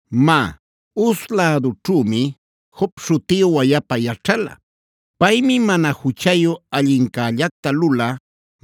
Má, Uz lädućhümi Job śhutiyu wayapa yaćhala. Paymi mana juchayu, allincällacta lulä,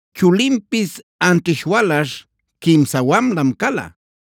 Chulinpis anćhish walaśh, quimsa wamlam cala.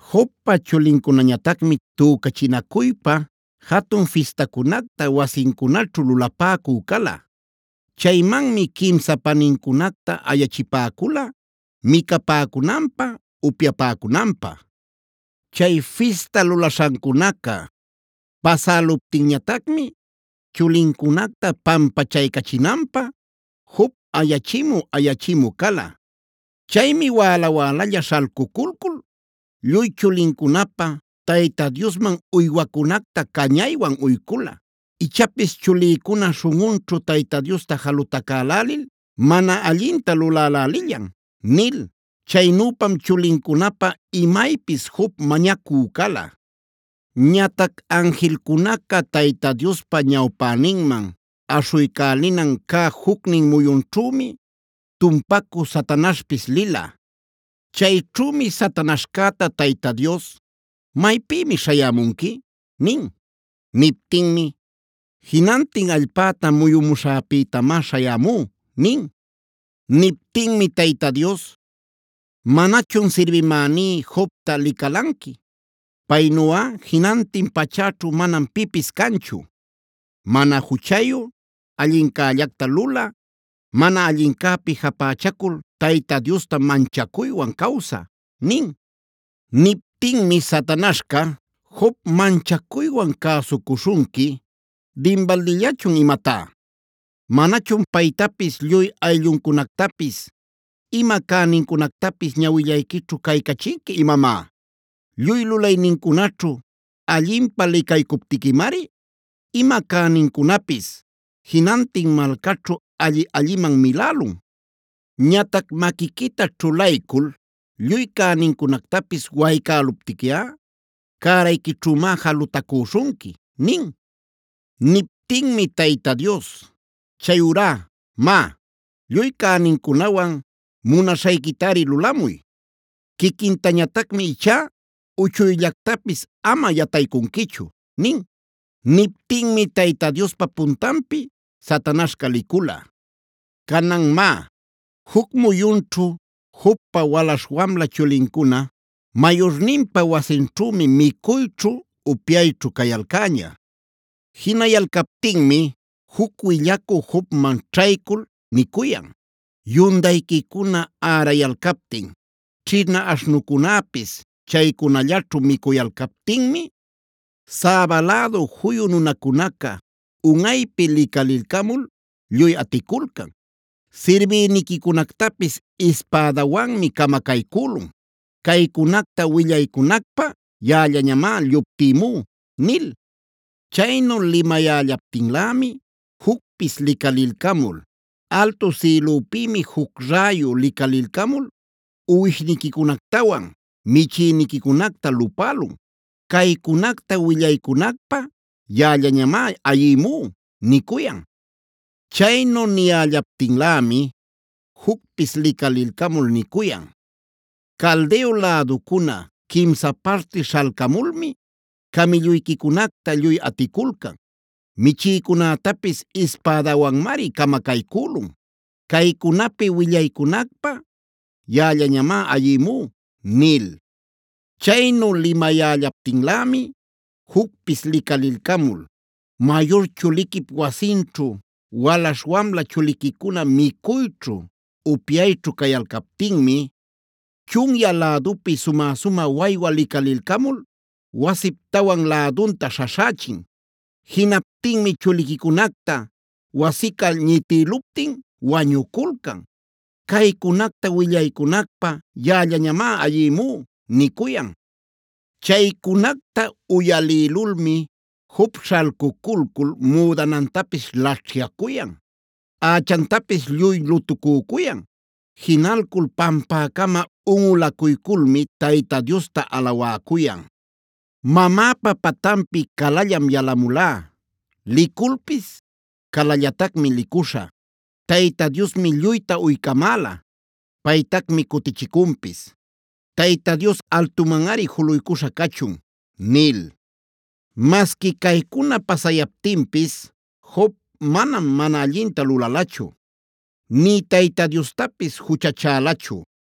Jobpa chulincunañatacmi tücachinacuypa jatun fistacunacta wasincunaćhu lulapäcü cala. Chaymanmi quimsan panincunacta ayachipäcula micapäcunanpä, upyapäcunanpä. Chay fista lulaśhancunaca pasäluptinñatacmi chulincunacta pampachaycachinanpä Job ayachimü-ayachimü cala. Chaymi wäla-wälalla śhalcuculcul lluy chulincunapä Tayta Diosman uywacunacta cañaywan uycula: “Ichapis chulïcuna śhunꞌunćhu Tayta Diosta jalutacälälil mana allinta lulälälillan” nil. Chaynüpam chulincunapä imaypis Job mañacü cala. Ñatac anjilcunacab Tayta Diospa ñawpäninman aśhuycälinan cä jucnin muyunćhümi tumpacü Satanaśhpis lila.c Chayćhümi Satanaśhcäta Tayta Dios: “¿Maypïmi śhayämunqui?” nin. Niptinmi: “Jinantin allpäta muyumuśhäpïtamá śhayämú” nin. Niptinmi Tayta Dios: “¿Manachun sirbimäní Jobta licalanqui? Paynuꞌa jinantin pachäćhu manam pipis canchu: mana juchayu, allincällacta lulä, mana allincäpi japächacul Tayta Diosta manchacuywan cawsä” nin. Niptinmi Satanaśhca: “¿¡Job manchacuywan cäsucuśhunqui dinbaldillachun imatá!? ¿¡Manachun paytapis, lluy aylluncunactapis, ima cänincunactapis ñawillayquićhu caycachinqui imamá!? Lluy lulaynincunaćhu allinpä licaycuptiquimari ima cänincunapis jinantin malcaćhu alli-alliman milälun. Ñatac maquiquita ćhulaycul lluy cänincunactapis waycäluptiquiꞌa cärayquićhümá jalutacüśhunqui” nin.d Niptinmi Tayta Dios: “Chayurá má, lluy cänincunawan munaśhayquitari lulamuy. Quiquintañatacmi ichá uchuyllactapis ama yataycunquichu” nin. Niptinmi Tayta Diospa puntanpi Satanaśhca licula. Canan má, juc muyunćhu Jobpa walaśh wamla chulincuna mayurninpa wasinćhümi micuyćhu, upyayćhu cayalcäña. Jinayalcaptinmi juc willacü Jobman ćhaycul nicuyan: “Yundayquicuna ärayalcaptin, ćhina aśhnucunäpis chaycunallaćhu micuyalcaptinmi, Sabae lädu juyu nunacunaca unꞌaypi licalilcamul lluy aticulcan. Sirbïniquicunactapis ispädawanmi camacaycülun. Caycunacta willaycunacpä yaꞌallañamá lluptïmú” nil. Chaynu limayällaptinlämi jucpis licalilcamul: “Altu sïlüpïmi juc räyu licalilcamul uwishniquicunactawan michïniquicunacta lupälun. Caycunacta willaycunacpä yaꞌallañamá ayïmú” nicuyan. Chaynu niyällaptinlämi jucpis licalilcamul nicuyan: “Caldeo läducuna quimsa parti śhalcamulmi camïlluyquicunacta lluy aticulcan. Michïcunätapis ispädawanmari camacaycülun. Caycunapi willaycunacpä yaꞌallañamá ayïmú” nil. Chaynu limayällaptinlämi jucpis licalilcamul: “Mayur chuliquip wasinćhu walaśh wamla chuliquicuna micuyćhu, upyayćhu cayalcaptinmi, chunyä lädupi sumä-sumä waywa licalilcamul wasip tawan lädunta śhaśhächin. Jinaptinmi chuliquicunacta wasica ñitïluptin wañuculcan. Caycunacta willaycunacpä yaꞌallañamá ayïmú” nicuyan. Chaycunacta uyalïlulmi Job śhalcuculcul müdanantapis laćhyacuyan, ächantapis lluy lutucücuyan. Jinalcul pampäcama unꞌulacuyculmi Tayta Diosta alawäcuyan: “Mamäpa patanpi calallam yalamulá. Liculpis calallatacmi licuśhä.f Tayta Diosmi lluyta uycamäla; Paytacmi cutichicunpis. Tayta Dios altumanꞌari juluycuśha cachun” nil. Masqui caycuna pasayaptinpis Job manam mana allinta lulalachu, nï Tayta Diostapis juchachälachu.